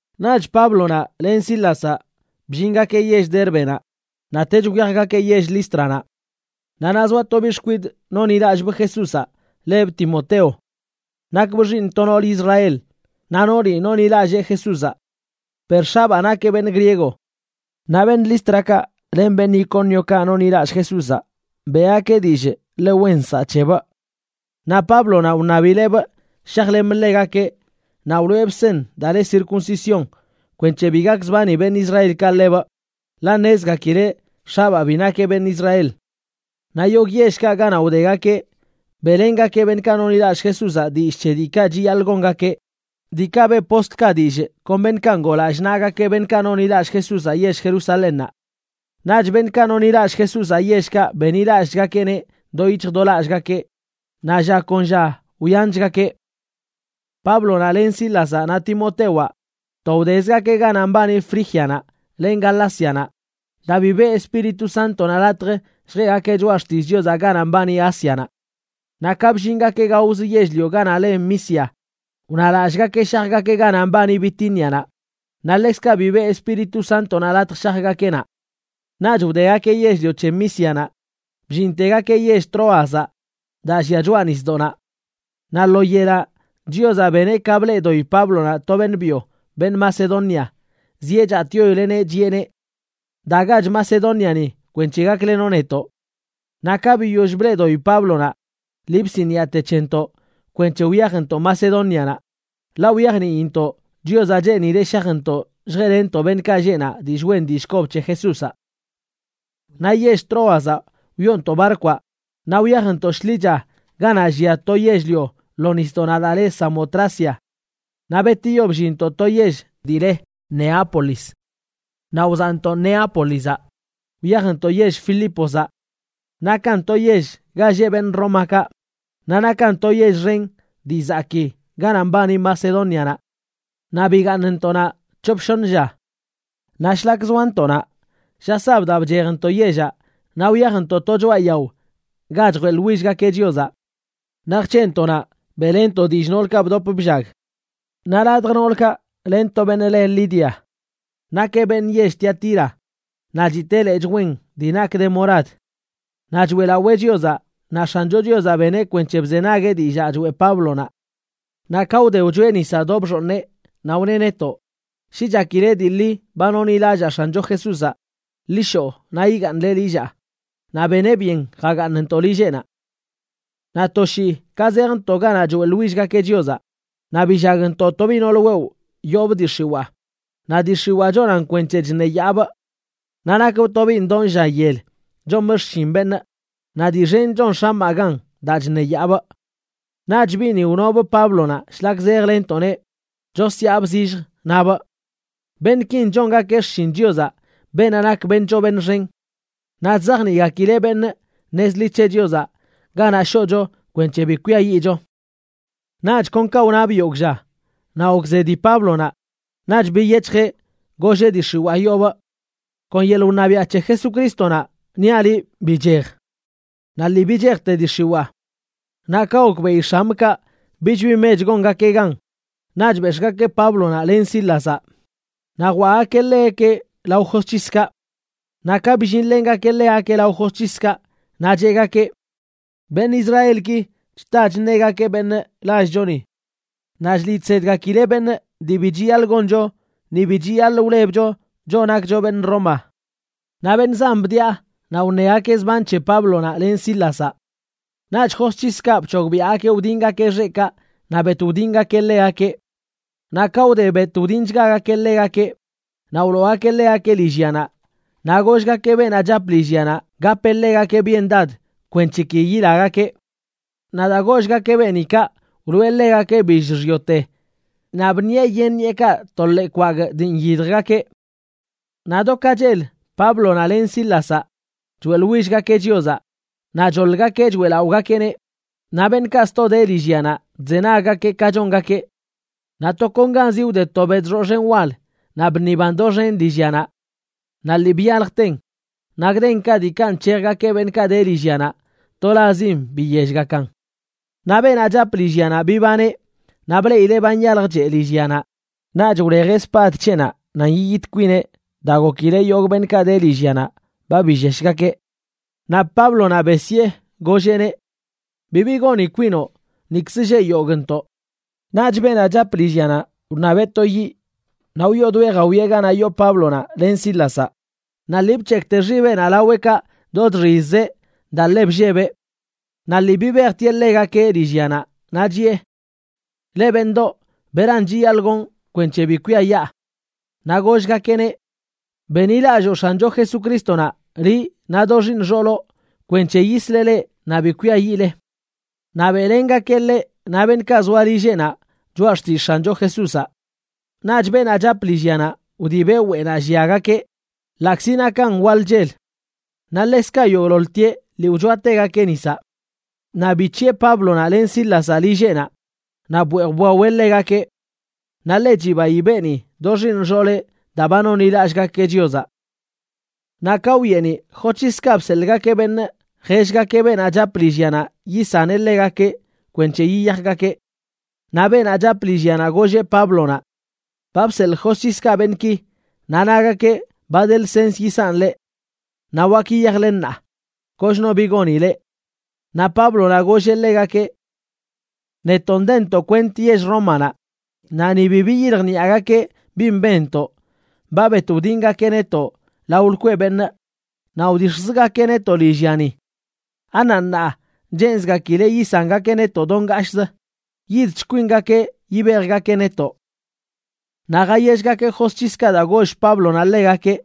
Naꞌch Páblonaꞌ len Sílazaꞌ bllingakeꞌ yell Dérbenaꞌ, naꞌtech wyajgakeꞌ yell Lístranaꞌ. Naꞌ naꞌ zoa to biꞌ xkwidꞌ nonḻilallꞌbꞌ Jesúzaꞌ lebꞌ Timoteo. Nakbꞌ xiiṉ to noolə Israel, naꞌ nooli nonḻilallee Jesúzaꞌ, per x̱abaa nakeꞌ beṉꞌ griego. Naꞌ beṉꞌ Lístrakaꞌ len beṉꞌ Icóniokaꞌ nonḻilallꞌ Jesúzaꞌ beꞌgakeꞌ dillꞌ ḻe wen nsaꞌ c̱hebꞌ. Naꞌ Páblonaꞌ wṉabileꞌbꞌ shajlemꞌ ḻegakeꞌ, naꞌ wloꞌebꞌ seṉ daa le circuncisión kwenc̱he bi gakzbani beṉꞌ Israelkaꞌ ḻebꞌ, ḻaꞌ ṉezgakileꞌ x̱abaa bi nakeꞌ beṉꞌ Israel. Naꞌ yogꞌ yellkaꞌ ganaꞌ wdegakeꞌ beꞌlengakeꞌ beṉꞌkaꞌ nonḻilallꞌ Jesúzaꞌ dillꞌ c̱he diikaꞌ chiyaḻꞌ gongakeꞌ, diikaꞌ beꞌ postlkaꞌ dillꞌ kon beṉꞌkaꞌ ngoo lallꞌ naꞌgakeꞌ beṉꞌkaꞌ nonḻilallꞌ Jesúzaꞌ yell Jerusalénnaꞌ. Naꞌch beṉꞌkaꞌ nonḻilallꞌ Jesúzaꞌ yellkaꞌ benḻilallꞌchgakeꞌneꞌ do yic̱hj do lallꞌgakeꞌ, naꞌ lla kon lla wyanchgakeꞌ. Páblonaꞌ len Sílazaꞌ naꞌ Timotewaꞌ to wdezgakeꞌ ganaꞌ mbani Frígianaꞌ len Galácianaꞌ, daa bi beꞌ Espíritu Sántonaꞌ latj lljeꞌgakeꞌ choꞌa xtillꞌ Chiozaꞌ ganaꞌ mbani Ásianaꞌ. Naꞌ ka bllingakeꞌ gaoz yell-lio ganaꞌ le Misia, wnalallꞌgakeꞌ shajgakeꞌ ganaꞌ mbani Bitínianaꞌ, naꞌ ḻekzkaꞌ bi beꞌ Espíritu Sántonaꞌ latj shajgakeꞌ naꞌ. Naꞌch wdegakeꞌ yell-lio c̱he Mísianaꞌ bllintegakeꞌ yell Tróazaꞌ daa llia choꞌa nisdoꞌnaꞌ. Naꞌ lo yelaꞌ Chiozaꞌ beneꞌ ka bleꞌdoꞌi Páblonaꞌ to beṉꞌ byo, beṉꞌ Macedonia, zieꞌ chatꞌyoileꞌneꞌ, chiꞌeneꞌ: “Dagach Macedóniani kwenc̱he gaklenoꞌ netoꞌ.” Naꞌ ka biyoll bleꞌdoꞌi Páblonaꞌ, lii bsiniꞌate c̱hentoꞌ kwenc̱he wyajntoꞌ Macedónianaꞌ, ḻaꞌ wyajniintoꞌ Chiozaꞌ cheenileꞌ shajntoꞌ lljeꞌlenntoꞌ beṉꞌkaꞌ lleꞌ naꞌ dillꞌ wen dillꞌ kob c̱he Jesúzaꞌ. Naꞌ yell Tróazaꞌ wyoontoꞌ barkwaꞌ naꞌ wyajntoꞌ shḻicha ganaꞌ llia to yell-lio lo nisdoꞌnaꞌ daa le Samotracia. Naꞌ betiyo bllinntoꞌ to yell dii le Neápolis. Naꞌ wzaꞌntoꞌ Neápolizaꞌ wyajntoꞌ yell Filípozaꞌ. Nakan to yell ga lleꞌ beṉꞌ Rómakaꞌ, naꞌ nakan to yell xen dii zakii ganaꞌ mbani Macedónianaꞌ. Naꞌ bigaaṉntoꞌ naꞌ c̱hop shoṉ lla. Naꞌ shlak zoantoꞌ naꞌ, lla sabdaꞌ bchejntoꞌ yellaꞌ naꞌ wyajntoꞌ to choꞌa yao ga chjeꞌḻwillgakeꞌ Chiozaꞌ. Naꞌ jc̱heꞌntoꞌ naꞌ, beꞌlenntoꞌ dillꞌ noolkaꞌ bdop bllag. Naꞌ ladj noolkaꞌ len to beṉꞌ le Lidia. Nakeꞌ beṉꞌ yell Tiatira, naꞌ chitee lechꞌ wen dii nak de morad. Naꞌ choeꞌlawee Chiozaꞌ naꞌ X̱ancho Chiozaꞌ beneꞌ kwenc̱he bzenagueꞌ dillaa choeꞌ Páblonaꞌ. Naꞌ ka wde wchoeꞌ nisaꞌ do bxooṉeꞌ, naꞌ wneꞌ netoꞌ: ―Shi chakile dii ḻi ba nonḻilallaa X̱ancho Jesúzaꞌ, ḻi shoꞌ naꞌ yigaaṉle lillaa. Naꞌ beneꞌ byen jagaaṉntoꞌ lilleꞌnaꞌ. Naꞌ to shii ka zejntoꞌ ganaꞌ choeꞌḻwillgakeꞌ Chiozaꞌ, naꞌ billagntoꞌ to biꞌ nool wewꞌ yoobꞌ dii x̱iwaa, naꞌ dii x̱iwaa chonan kwenc̱he chṉeyaabꞌ. Naꞌ nakbꞌ to biꞌ ndoo lla yel chomꞌ xshin beṉꞌ, naꞌ dii xen chon x̱amaꞌ gan daa chṉeyaabꞌ. Naꞌch biꞌni wnobꞌ Páblonaꞌ shlak zejlennntoꞌneꞌ, chosyaabꞌ zillj, nabꞌ: ―Beṉꞌkin chongakeꞌ xshin Chiozaꞌ, beenaꞌ nak beṉꞌ choo beṉꞌ xen, naꞌ chzajniꞌgakileꞌ beṉꞌ nez ḻi c̱he Chiozaꞌ ganaꞌ shoꞌcho kwenc̱he bi kwiayiꞌcho. Naꞌch kon kaꞌ wnabꞌ yogꞌ lla, naꞌ gokzedi Páblonaꞌ, naꞌch biyec̱hjeꞌ, golleꞌ dii x̱iwaa yoobꞌ: ―Kon yeḻꞌ wṉabiaꞌ c̱he Jesucrístonaꞌ niaꞌ liꞌ bichej. Naꞌ lii bichejte dii x̱iwaa. Naꞌ ka gokbeꞌi x̱amꞌkaꞌ bich bi mech gongakeꞌ gan, naꞌch bex̱ꞌgakeꞌ Páblonaꞌ len Sílazaꞌ naꞌ jwaꞌgakeꞌ ḻegakeꞌ lao josc̱hiskaꞌ. Naꞌ ka bllinlengakeꞌ ḻegakeꞌ lao josc̱hiskaꞌ, naꞌ cheꞌgakeꞌ: ―Beṉꞌ Israelki chta chṉegakeꞌ beṉꞌ, lallchoni. Naꞌ chliꞌ chsedgakileꞌ beṉꞌ dii bi chiyaḻꞌ goncho ni bi chiyaḻꞌ wlebcho, choꞌ nakcho beṉꞌ Roma. Naꞌ beṉꞌ zan bdiꞌa naꞌ wṉegakeꞌ zban c̱he Páblonaꞌ len Sílazaꞌ. Naꞌch josc̱hiskaꞌ bc̱hogbiaꞌgakeꞌ wdiṉgakeꞌ xeꞌkaꞌ naꞌ bet wdingakeꞌ ḻegakeꞌ. Naꞌ ka wde bet wdinchgagakeꞌ ḻegakeꞌ, naꞌ wloogakeꞌ ḻegakeꞌ lillyanaꞌ, naꞌ gollgakeꞌ beenaꞌ chap lillyanaꞌ gapeꞌ ḻegakeꞌ byendad kwenc̱he ki yilagakeꞌ. Naꞌ daa gollgakeꞌ beeni kaꞌ, wloꞌe ḻegakeꞌ billꞌ xyoote naꞌ bṉiꞌe yen ṉiꞌekaꞌ to ḻee kwagꞌ dii nyidjgakeꞌ. Naꞌ do ka chel Páblonaꞌ len Sílazaꞌ choeꞌḻwillgakeꞌ Chiozaꞌ naꞌ choḻgakeꞌ choeꞌlaꞌogakeꞌneꞌ, naꞌ beṉꞌkaꞌ sto de lillyanaꞌ chzenaggakeꞌ ka chongakeꞌ. Naꞌ tokonganzi wde to bedxoꞌ xen wal naꞌ bṉiban doxen lillyanaꞌ. Naꞌ lii byaljten, naꞌ gdenkaꞌ diikaꞌ nc̱hejgakeꞌ beṉꞌkaꞌ de lillyanaꞌ tolazzin biyellgakan. Naꞌ beenaꞌ chap lillyanaꞌ bibaneꞌ naꞌ bleꞌileꞌ ba nyaljchee lillyanaꞌ, naꞌch wlejeꞌ spad c̱heꞌnaꞌ nan yiyit kwineꞌ daa gokileꞌ yogꞌ beṉꞌkaꞌ de lillyanaꞌ ba billeshgakeꞌ. Naꞌ Páblonaꞌ besyee, golleꞌneꞌ: ―¡Bibi goni kwinoꞌ! Nikz lleꞌ yogꞌntoꞌ. Naꞌch beenaꞌ chap lillyanaꞌ wṉabeꞌ to yiꞌ naꞌ wyoodoeꞌ jawieꞌ ganaꞌ yoo Páblonaꞌ len Sílazaꞌ, naꞌ lii bc̱hekꞌte xibeꞌnaꞌ laweꞌkaꞌ do chxizzeꞌ daa ḻe bllebeꞌ. Naꞌ lii bibejtieꞌ ḻegakeꞌ lillyanaꞌ, naꞌ chiꞌe: ―¿Leꞌ, beṉꞌdoꞌ, beran chiyaḻꞌ gonꞌ kwenc̱he bi kwiayaa? Naꞌ gollgakeꞌneꞌ: ―Benḻilalloo X̱ancho Jesucrístonaꞌ, liꞌ naꞌ do xiiṉ xooloꞌ, kwenc̱he yisleꞌ leꞌ naꞌ bi kwiayiꞌle. Naꞌ beꞌlengakeꞌ ḻeꞌ naꞌ beṉꞌkaꞌ zoa lilleꞌnaꞌ choꞌa xtillꞌ X̱ancho Jesúzaꞌ. Naꞌch beenaꞌ chap lillyanaꞌ wdibeꞌ weꞌnaꞌ lliagakeꞌ, ḻaꞌkzi nakan waḻ chel. Naꞌ ḻekzkaꞌ yogꞌḻoḻtieꞌ lii wchoategakeꞌ nisaꞌ. Naꞌ bic̱hiꞌe Páblonaꞌ len Sílazaꞌ lilleꞌnaꞌ naꞌ bweej bwaweꞌ ḻegakeꞌ. Naꞌ ḻe chibayi beeni do xiiṉ xooleꞌ daa ba nonḻilallꞌgakeꞌ Chiozaꞌ. Naꞌ ka wyeeniꞌ, josc̱hiskaꞌ bseḻꞌgakeꞌ beṉꞌ jellgakeꞌ beenaꞌ chap lillyanaꞌ yisaneꞌ ḻegakeꞌ kwenc̱he yiyajgakeꞌ. Naꞌ beenaꞌ chap lillyanaꞌ golleꞌ Páblonaꞌ: ―Ba bseḻꞌ josc̱hiskaꞌ beṉꞌki, naꞌ nagakeꞌ ba de lsens yisanꞌ leꞌ. Naꞌ wak yiyajle ṉaa, kochno bi goni leꞌ. Naꞌ Páblonaꞌ golleꞌ ḻegakeꞌ: ―Netoꞌ ndentoꞌ kwent yell Rómanaꞌ, naꞌ ni bi biyiljniꞌagakeꞌ bin benntoꞌ ba bet wdingakeꞌ netoꞌ lao lkweꞌ beṉꞌ naꞌ wdix̱jzgakeꞌ netoꞌ lillyani. ¿Anaꞌ ṉaa cheenzgakileꞌ yisangakeꞌ netoꞌ do ngashꞌzə? Yidch kwingakeꞌ yibejgakeꞌ netoꞌ. Naꞌ jayellgakeꞌ josc̱hiskaꞌ daa goll Páblonaꞌ ḻegakeꞌ,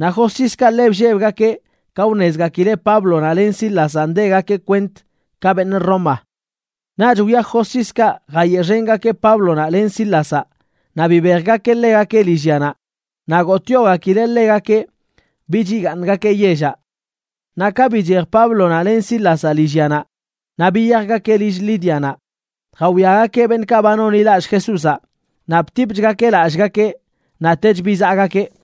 naꞌ josc̱hiskaꞌ ḻe bllebgakeꞌ ka wṉezgakileꞌ Páblonaꞌ len Sílazaꞌ ndegakeꞌ kwent ka beṉꞌ Roma. Naꞌch wyaj josc̱hiskaꞌ jayeꞌxengakeꞌ Páblonaꞌ len Sílazaꞌ naꞌ bibejgakeꞌ ḻegakeꞌ lillyanaꞌ, naꞌ gotꞌyogakileꞌ ḻegakeꞌ bich yigaaṉgakeꞌ yellaꞌ. Naꞌ ka bichej Páblonaꞌ len Sílazaꞌ lillyanaꞌ, naꞌ biyajgakeꞌ lill Lídianaꞌ jawiagakeꞌ beṉꞌkaꞌ ba nonḻilallꞌ Jesúzaꞌ naꞌ btipchgakeꞌ lallꞌgakeꞌ, naꞌtech bizaꞌgakeꞌ.